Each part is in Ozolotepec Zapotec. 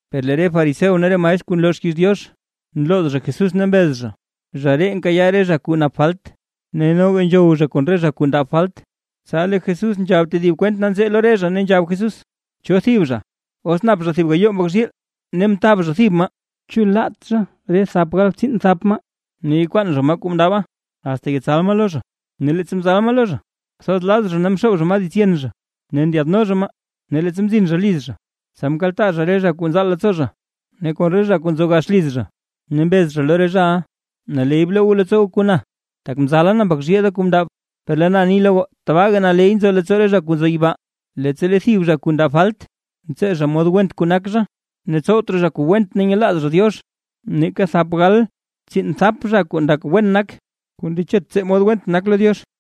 Per lee re fariseo ne re maestr kuu nloo xkiiz Diox, nlooz zha Jesús ne mbez zha: ―¡Zha ree nkayaa re zha kuu nap falt ne noga nzhow zha kon re zha kuu ndab falt! Tsa lee Jesús nzhab tedib kwent nanzee lo re zha, ne nzhab Jesús: ―¿Cho thib zha, os nap zha thib gayoo mbak zhiil ne mtab zha thib maa? ¿Chu laat zha re thap gal tsiinbthap maa ne yakwaan zha maa kuu mndaba, asta yetsal maa lo zha? Ne leettsa mzal maa lo zha, kwathoz laz zha ne mxoob zha maa dits yen zha ne ndyaadno zha maa, ne leettsa mzin zha liz zha, tsa mkaltaa zha re kuu nzaal leettsoo zha ne kon re zha kuu nzo gax liz zha, ne mbez zha lo re zhaʼa: “Naley bloo goo leettsoo goo kon na, tak mzala na mbak zhiil da kuu mndab”. Per lee na ni lo goo, tabaaga naley nzo leettsoo re zha kuu nzo yibaa, leettsa lee thib zha kuu ndab falt, ntsee zha mod went kuu nak zha, ne tsowt raa zha kuu went ne nyelaaz zha Diox, nake thap gal tsiinbthap zha kuu ndak wen nak, kuu ndechet tsee mod went nak lo Diox.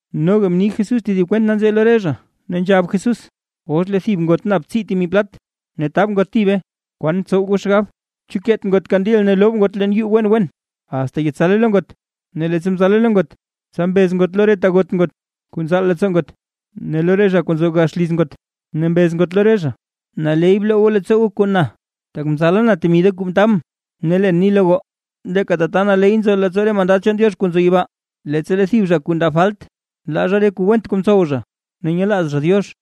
Noga mni Jesús tedib kwent nanzee lo re zha, ne nzhab Jesús: ―Os lee thib ngot nap tsii temi plat ne tab ngot thibe, ¿kwan ntsow goo xgab? ¿Chu keet ngot kandil ne loob ngot yuu wen wen, asta yetsale lo ngot? Ne leettsa mzale lo ngot, tsa mbez ngot re ta got ngot kuu nzaal leettsoo ngot ne lo re zha kuu nzo gax liz ngot, ne mbez ngot lo re zha: “Naley bloo goo leettsoo goo kon na, tak mzala na temi da kuu mtabʼn”. Ne leen ni lo goo, leeka tata naley nzo leettsoo re mandad chaan Diox kuu nzo yibaa, leettsa lee thib zha kuu ndab falt, nlaa zha re kuu went kuu mtsowt zha ne nyelaaz zha Diox.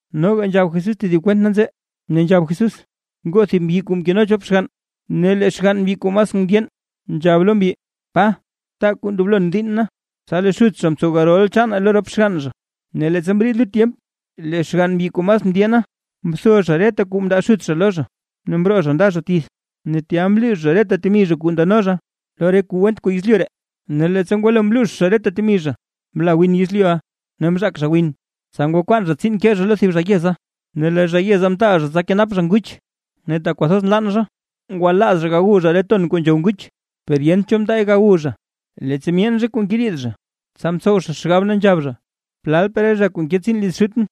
Noga nzhab Jesús tedib kwent nanzee, ne nzhab Jesús: ―Ngoo thib mbyi kuu mkeno chop xgann. Ne lee xgann mbyi kuu mas mndyeen, nzhab lo mbyi: “Pa, taa kuu ndoblon diinn na”. Tsa lee xut zha mtsow garol chaane lo rop xgann zha. Ne leettsa mriid lut tyemp lee xgann mbyi kuu mas mndyeena, mtho zha reta kuu mndaa xut zha lo zha, ne mroo zha nda zha tith. Ne tya mluux zha reta temi zha kuu ndano zha, lo re kuu went kuu yezlyu ree. Ne leettsa ngwalo mluux zha reta temi zha, mla win yezlyuʼa, ne mzhaak zha win. Tsa ngwakwaan zha tsiin ke zha lo thib zha yeza, ne lee zha yeza mtaal zha tsa kenap zha nguch. Ne tak kwathoz nlann zha, ngwalaaz zha gawu zha re ton kuu nzhow nguch, per yent cho mndaay gawu zha. ’Leettsa myeen zha kuu ngeriid zha, tsa mtsow zha xgab, ne nzhab zha: “¡Plalpaa re zha kuu nke tsiin liz xutʼn,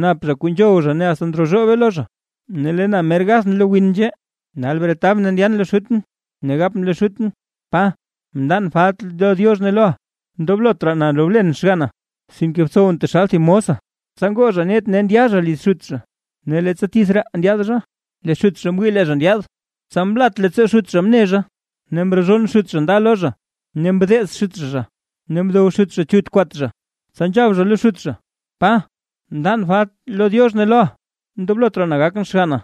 nap zha kuu nzhow zha ne asta ndrozhoobee lo zha! ¡Ne lee na mer gath lo win nzhee!” Nal bretabʼn ne ndyan lo xutʼn, ne gapʼn lo xutʼn: “Pa, mndan falt lo Diox ne loʼa, ndoblot raa na rolen xganna, sinke btsowʼn taxal thib mosa”. ’Tsa ngoo zha net ne ndya zha liz xut zha. Ne leettsa tith raa ndyaad zha, lee xut zha mwii lee zha ndyaad, tsa mlat leettsoo xut zha mne zha. Ne mrozhonn xut zha nda lo zha ne mdeez xut zha zha, ne mdow xut zha chut kwat zha. Tsa nzhab zha lo xut zha: “Pa, mndan falt lo Diox ne loʼa, ndoblot raa na gakʼn xganna”.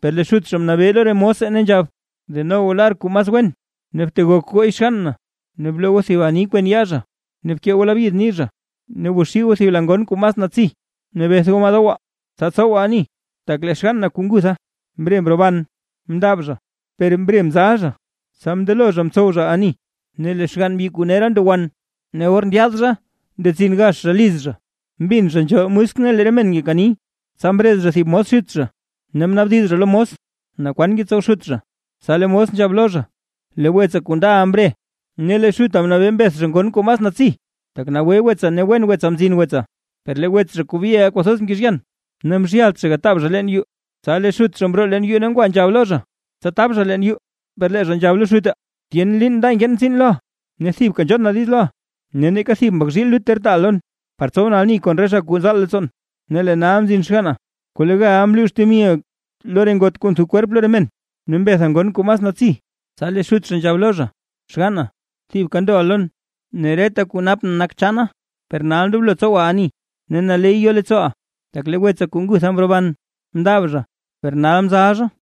Per lee xut zha mnabee lo re mose ne nzhab: “Deno goo lar kuu mas wen ne btegok gooy xgann na, ne bloo goo thib ani kwen yaa zha ne bkee goo labyid nii zha. Ne gwaxii goo thib la ngon kuu mas natsi, ne beth goo maa dowaa, tsa tsowaa ani, tak lee xgann na kuu ngutha, mre mroban, mndab zha per mre mzal zha.” Tsa mndelo re zha mtsow zha ani. ’Ne lee xgann mbyi kuu nera ndo wan, ne or ndyaad zha ndetsin gax zha liz zha, mbin zha nzhool musk ne lee re men ngekani. Tsa mrez zha thib mos xut zha, ne mnaabdiz zha lo mos, naa kwan ngetsow xut zha. Tsa lee mos nzhab lo zha: “Lee wetsa kuu ndaʼa mre, ne lee xuta mnabee mbeth zha ngon kuu mas natsi, tak nagwe wetsa ne wen wetsa mzin wetsa”. ’Per lee wets zha kuu byeʼa kwathoz mkezhyan, ne mzhyalt zha gataab zha leen yuu. Tsa lee xut zha mroo leen yuu ne ngwa nzhab lo zha, tsa tab zha leen yuu. Per lee zha nzhab lo xute: “Tyen liin nda nkeen tsiin loʼa ne thibka nzhon na diiz loʼa, ne neeka thib mbak zhiil lut ter taaʼa lon, par tsowʼn ani kon re zha kuu nzaal leettsoon. Ne lee nal mzin xganna kuu legal mluux temiʼa lo re ngot kuu ntho kwerp lo re men, ne mbetha ngon kuu mas natsi.” ’Tsa lee xut zha nzhab lo zha: “Xgann na, thibka ndoʼa lon, ne reta kuu napʼn nak chaana. Per nal ndoblo tsowaa ani ne naley yoo leettsooʼaa, tak lee wetsa kuu ngutha mroban, mndab zha per nal mzala zha.”